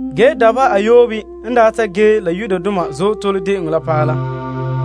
Ge dabeha ayoobe n daa ta ge la Azootole De'eŋɔ la paɛ la,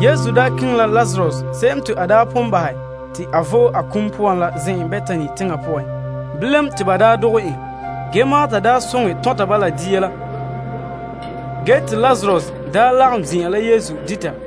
Yesu keŋɛ la Lazarus se'em te a pon bahɛ te a vo'e a kum poan la zen'en Betani teŋa poan. Bilam, te ba dogɛ en dia. Ge, Marta soŋɛ tɔnta ba la dia la ge te Lazarus daa lagom zin'an la Yesu dita.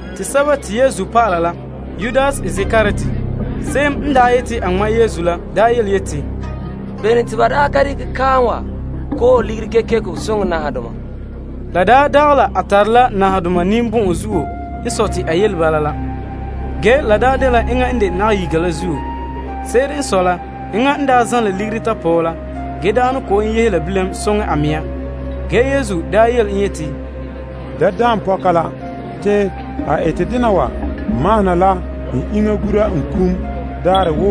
Te Yesu dɔlɔba la yema, Yudas Iskariot se'em n daa yeti a ŋma' Yesu la daa yeti, Bene te ba ka dekɛ kaam wa koohe ligiri kekeko soŋɛ nahadoma? La dagɛ la a tare la nahadoma ninbɔn'ɔn zuo n sɔe ta yele bala la. Ge, la dela enŋa n de nayiga la zuo. Se'ere n sɔe la, enŋa n zanlɛ ligiri tapɔɔ la, ge ne kɔ'ɔn yehe la bilam soŋa a mea. Ge, Yesu yele en yeti, Da daan pɔka la. Te a ete dena wa mahona la n iŋa gura n kum daarɛ.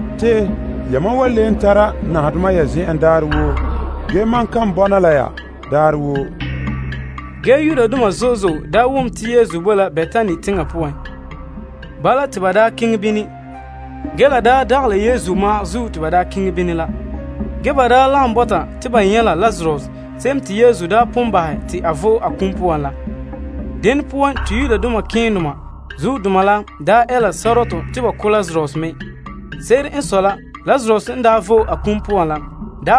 Te yamam wan le tara nahadoma ya zen'en daarɛ woo. Ge, mam kan bɔna la ya daarɛ woo. Ge Yudoma zo'e zo'e daa wom te Yesu bo la Betani teŋa poan. Bala, te ba daa keŋɛ bini. Ge la daa dagɛ la Yesu ma'an zuo te ba daa keŋɛ bini la. Ge, ba lagom bɔta te ba nyɛ' la Lazarus se'em te Yesu pon bahɛ te a vo'e a kum poan la. Dene poan, te malema keendoma la ɛ la sɔrɔtɔ te ba ko' Lazarus me. Se'ere n sɔe la, Lazarus n vo'e a kum poan la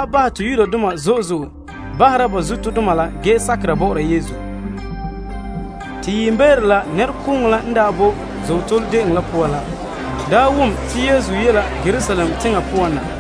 bahɛ te Yudoma zo'e zo'e bahera ba zuodoma la ge sakera bɔ'ɔra Yesu. Te yiimbeere la, nɛrekooŋɔ la n daa boe Azootole De'eŋɔ la poan la, wom te Yesu ye la Yerusalem teŋa poan na.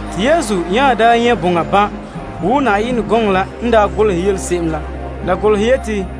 Te Yesu nya nyɛ' boŋa ban' wo Yenɛ gɔŋɔ la n daa golehɛ yele se'em la. La golehɛ yeti,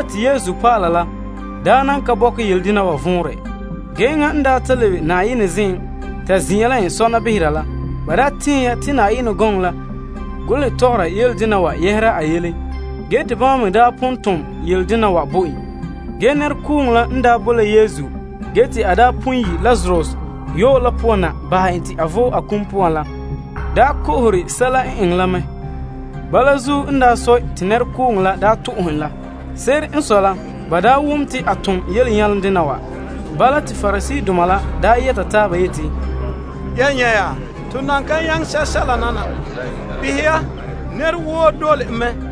Ge, Yesu dɔlɔba la daa nan ka bɔkɛ yele dena wa vɔnrɛ. Ge, enŋa n ta lebe Na'ayenɛ zen'en ta zin'an la en sɔna behera la, ba daa tɛɛn ya te Yenɛ gɔŋɔ la golehɛ tɔgɔra yele dena yɛhera a yele. Ge te bama me daa pon tom yele dena wa bo en. Ge nɛrekooŋɔ la n daa boe la Yesu te a pon yi' Lazarus yɔɔ la poan na bahɛ en te vo'e a kum la poan la, ko'ohe sɛla n eŋɛ la mɛ. Bala zuo n sɔe, te nɛrekooŋɔ la to'ohɛ en la. Se'ere n sɔe la, ba wom te a tom yelenyaledena wa. Bala, te Pariseedoma la yɛta taaba yeti, Ya nyɛ' ya, to nan ka nyaŋɛ sɛsɛla nana. Behɛ ya, nɛra woo dole en mɛ.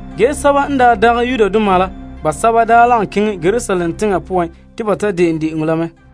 Ge Greekdoma basɛba daa lagom keŋɛ Yerusalem teŋa poan te ba de'en de'eŋɔ la mɛ.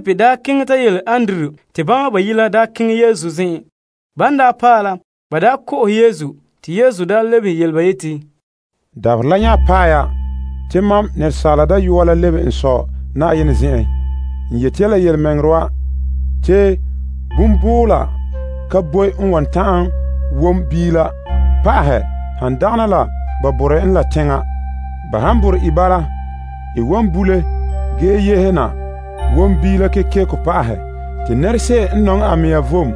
Te Filip keŋɛ ta yele Andrew te bama bayi' la keŋɛ Yesu zen'en. Ban paɛ la, ba ko'ohe Yesu. Te Yesu daa lebehe yele ba yeti, Dabaherɛ la nya paɛ ya te Asaala Dayɔa la lebe n Sɔ Na'ayenɛ zen'en. N yeti ya la yelemɛŋɛrɛ wa, te biiho ka boe n wan ta'an wom biila pa'ahɛ han dagana la ba borɛ en la teŋa. Ba han borɛ i bala, i wan bule ge yehe na wom biila kekeko pa'ahɛ. Te nɛrese'em n nɔŋɛ a mea vom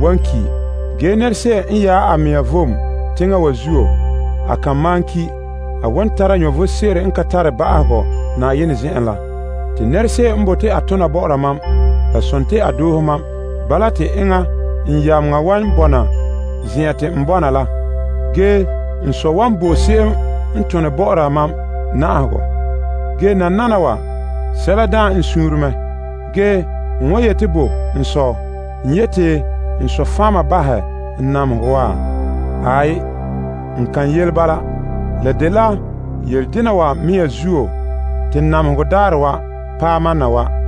wan ki'. Ge nɛrese'em n yaɛ a mea vom teŋa wa zuo, a kan malom ki'. A wan tara vom sebo n ka tare ba'ahegɔ Na'ayenɛ zen'en la. Te nɛrese'em n bote a tona bɔ'ɔra mam, la sontii a doohe mam. Bala, te enŋa n yameŋa wan bɔna zen'an te n bɔna la. Ge n Sɔ wan bo se'em n tone bɔ'ɔra mam na'ahegɔ. Ge nananawa, sɛla daan n suunre mɛ. Ge n wan yeti bo n Sɔ? N yeti n Sɔ fan' mam bahɛ n namehegɔ wa? Aai, n kan yele bala. La dela yele dena wa mea zuo te namehegɔ daarɛ wa paɛ mam na wa.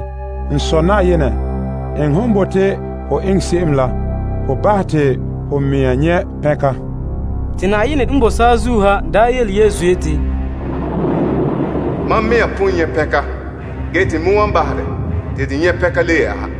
N Sɔ Na'ayenɛ, eŋɛ hon bote ho eŋɛ se'em la ho bahɛ te ho yu'urɛ n nyɛ' pɛnka. Te konkore n ze'ele saazuo ha yeti, Mam pon bahɛ te dɛ nyɛ' pɛnka ge te n me wan bahɛ dɛ te de nyɛ' pɛnka le yɛ'ɛha.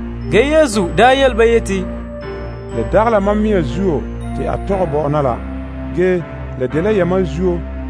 Ge, Yesu daa yele ba yeti, La dagɛ la mam zuo te a tɔgɛ bo mam na la. Ge, la dela yamam zuo.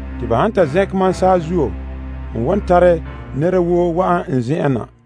Te ba han ta zɛnkɛ mam saazuo, n wan tare nɛra woo wa'an n zen'en na.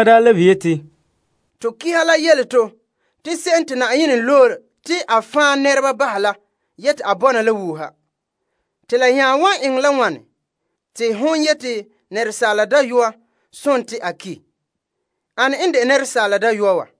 Nɛrekooŋɔ la lebehe yeti, To Pa'alegɔ la yele to te se'em te Na'ayenɛ loe wan bɔna la wuuha. Te la nya wa eŋɛ la wane te hon yeti Asaala Dayɔa sontii a ki'? Ane n de Asaala Dayɔa wa?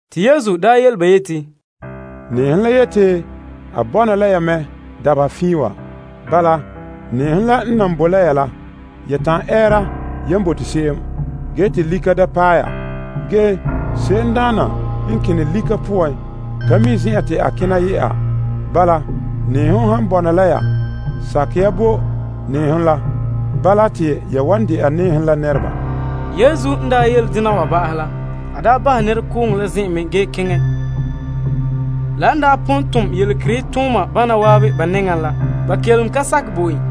Te Yesu yele ba yeti, Nɛɛhom la yeti a bɔna la ya mɛ dabeha fiin wa. Bala, nɛɛhom la n nan boe la ya la, ya ta'an ɛɛra yan bote se'em, ge te lika da paɛ ya. Ge se'em n kene lika poan ka mi' zen'an te a kena ye'a. Bala, nɛɛhom han bɔna la ya, sakɛ ya bo nɛɛhom la. Bala, te ya wan de'a nɛɛhom la nɛreba. Yesu n daa yele dena wa ba'ahɛ la, a daa bahɛ nɛrekooŋɔ la zen'en mɛ ge keŋɛ. La n daa pon tom yelekerehe tooma bana waabe ba nɛŋa la, ba kelom ka sakɛ bo en.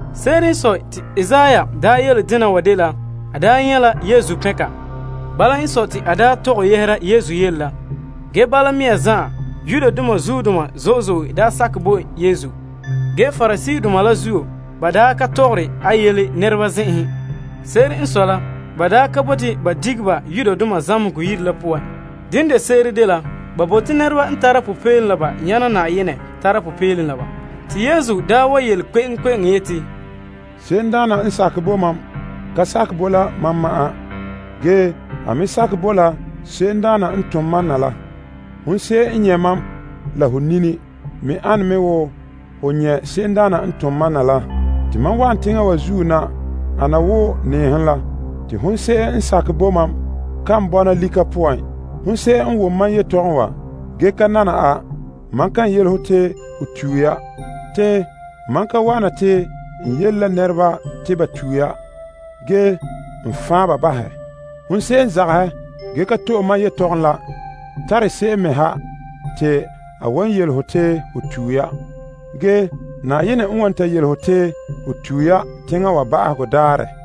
Se'ere n sɔe, te Isaiah daa yele dena wa dela a nyɛ' la Yesu pɛnka. Bala n sɔe, te a daa tɔgɛ yɛhera Yesu yele la. Ge bala mea zan'an, Yudoma zuodoma zo'e zo'e sakɛ bo Yesu. Ge, Pariseedoma la zuo, ba ka tɔgɔre de yele nɛreba zen'enhen. Se'ere n sɔe la, ba ka bote ba dige ba zamehegɔ yire la poan. Dene de se'ere dela ba bote nɛreba n tara popeelom la ba yaana Na'ayenɛ tara popeelom la ba. Te Yesu wa yele kpe'eŋkpe'eŋo yeti, Se'emdaana n sakɛ bo mam ka sakɛ bo la mam ma'an. Ge, a me sakɛ bo la se'emdaana n tom mam na la. Hon se'em n nyɛ' mam la ho nini me ane mɛ wo ho nyɛ' se'emdaana n tom mam na la. Te mam wa'an teŋa wa zuo na ana wo nɛɛhom la. Te hon se'em n sakɛ bo mam kan bɔna lika poan. Hon se'em n wom mam yetɔgɔm wa ge ka nana a, mam kan yele ho te ho tue ya. Te mam ka wa'an na te n yele la nɛreba te ba tue ya. Ge n faan ba bahɛ. Hon se'em n zagahɛ ge ka to'e mam yetɔgɔm la tare se'em me ha te a wan yele ho te ho tue ya. Ge Na'ayenɛ n wan ta dekɛ mam yelehom sebo wa yele ho te ho tue ya teŋa wa ba'ahegɔ daarɛ.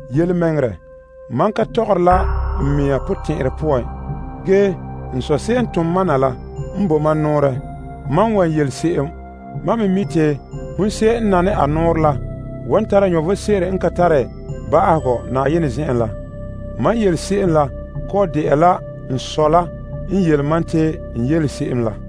Yelemɛŋɛrɛ, mam ka tɔgɔre la n mea potɛn'ɛrɛ poan. Ge, n Sɔ se'em n tom mam na la n bo mam nɔɔrɛ, mam wan yele se'em. Mam me mi' te hon se'em n nane a nɔɔrɛ la, wan tara vom sebo n ka tare ba'ahegɔ Na'ayenɛ zen'en la. Mam yele se'em la kɔ'ɔn de'a la n Sɔ la n yele mam te n yele se'em la.